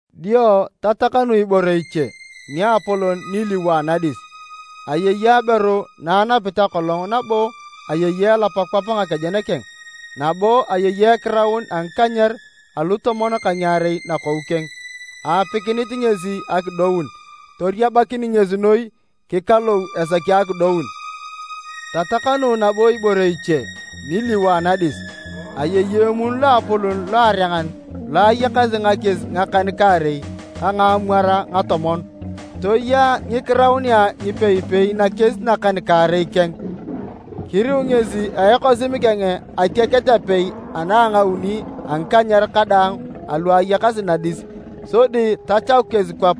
Dio tatakanu ibore iche niapolon niliwo anadis. Ayei aberu na anapit akolong nabo ayei elap kwap ngakejen keng nabo ayei ekiraun a ngikanyer alutomon ka ngiarei nakou keng. Aapikinit ngesi akidoun, toriabakin ngesi noi kikalou esaki akidoun. Tatakanu nabo ibore iche niliwo anadis. Ayei emun loapolon loarengan lo ayakasi ngakies ngakan-kaarei ka ngaamwar ngatomon, toya ngikiraunea ngipei-pei nakies nakan-kaarei keng. Kiriu ngesi a ekosim keng atiaket apei ana a ngauni a ngikanyer kadaang alu ayakasi nadis sodi tachaku kesi kwap.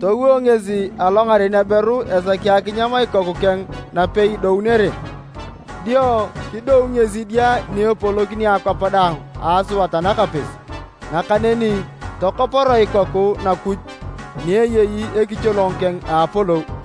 Towo ngesi alongaren aberu esaki akinyam ikoku keng napei idounere. Dio kidou ngesi idia ni epolokini akwap daang a asuat anakapis. Nakaneni tokoporoe ikoku Nakuj ni eyei ekicholong keng a apolou.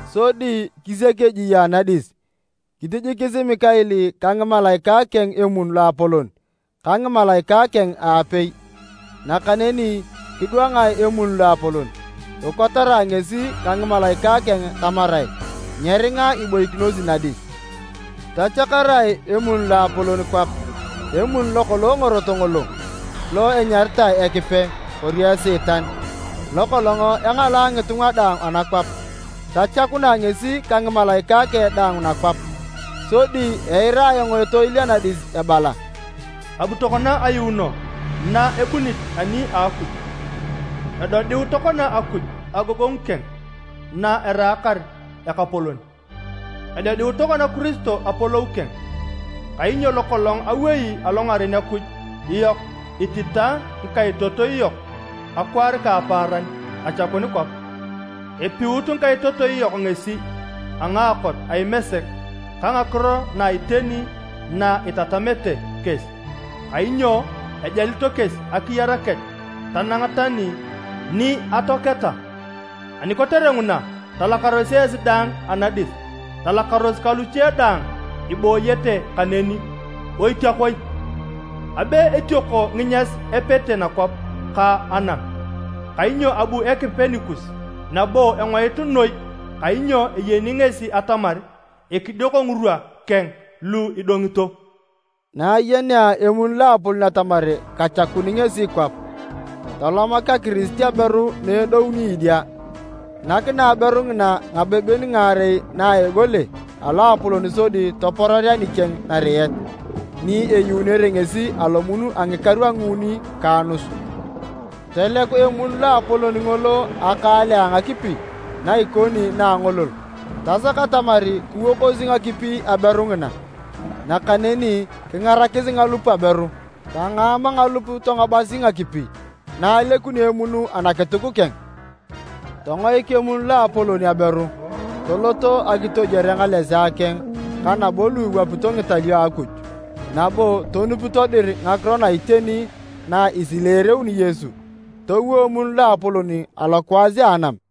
Sodi kisiak ejie anadis. Kitijikis Mikael ka ngimalaikae keng emun loapolon ka ngimalaikae keng aapei, nakaneni kidwangae emun loapolon, kikotarae ngesi ka ngimalaikae keng tamarae nyeringa iboikinosi nadis. Tachakarae emun loapolon kwap, emun lokolong ngorot ngolo, lo enyaritae Ekipe, kori Esiitan, lokolong engalae ngitunga daang anakwap. Tochakunae ngesi ka ngimalaikae keng daang nakwap. Sodi eira ayong etoil anadis ebala, “Abu tokona ayuuno na ebunit ani a Akuj! Edodiu tokona Akuj agogongu keng na eraakar Ekapolon! Edodiu tokona Kiristo apolou keng! Kainyo lokolong awei alongaren Akuj yok ititae ngikaitotoi yok akwaar ka apaaran, achakun kwap. Epiut ngikaitotoi yok ngesi a ngaakot a Imesek ka ngakiro na iteni na etatamete kesi, kainyo ajalito kesi akiyar kech tanang tani ni atoaketa. Ani kotere nguna, talakaros esi daang anadis, talakaros ka luche daang ibooyete kaneni! Oitiakoi! Abe etioko nginyas epete nakwap ka anam! Kainyo abu Ekipe nikus, nabo engoit noi kainyo eyeni ngesi atamar ekidioko ngirwa keng lu idongito.” Na ayenea emun loapolon atamar kachakun ngesi kwap, tolomak akirisit aberu na edouni idia. Nakinae aberu ngina ngabeben ngaarei na a egole aloapolon sodi topororea nikeng nariet, ni eyuunere ngesi alomun a ngikaru a nguuni ka anus. Toleku emun loapolon ngolo akaale a ngakipi na ikoni na a angolol, tasak atamar kiwokosi ngakipi aberu ngina. Nakaneni kingarakis ngalup aberu, tangaama ngalup tongobasi ngakipi na alekuni emun anakituk keng. Tongoik emun loapolon aberu, tolot akitojwore ngalesea keng ka nabo lu iwapito ngitalio a Akuj, nabo tonupito dir ngakiro na iteni na esileereuni Yesu. Towo emun loapolon alokwaas a anam.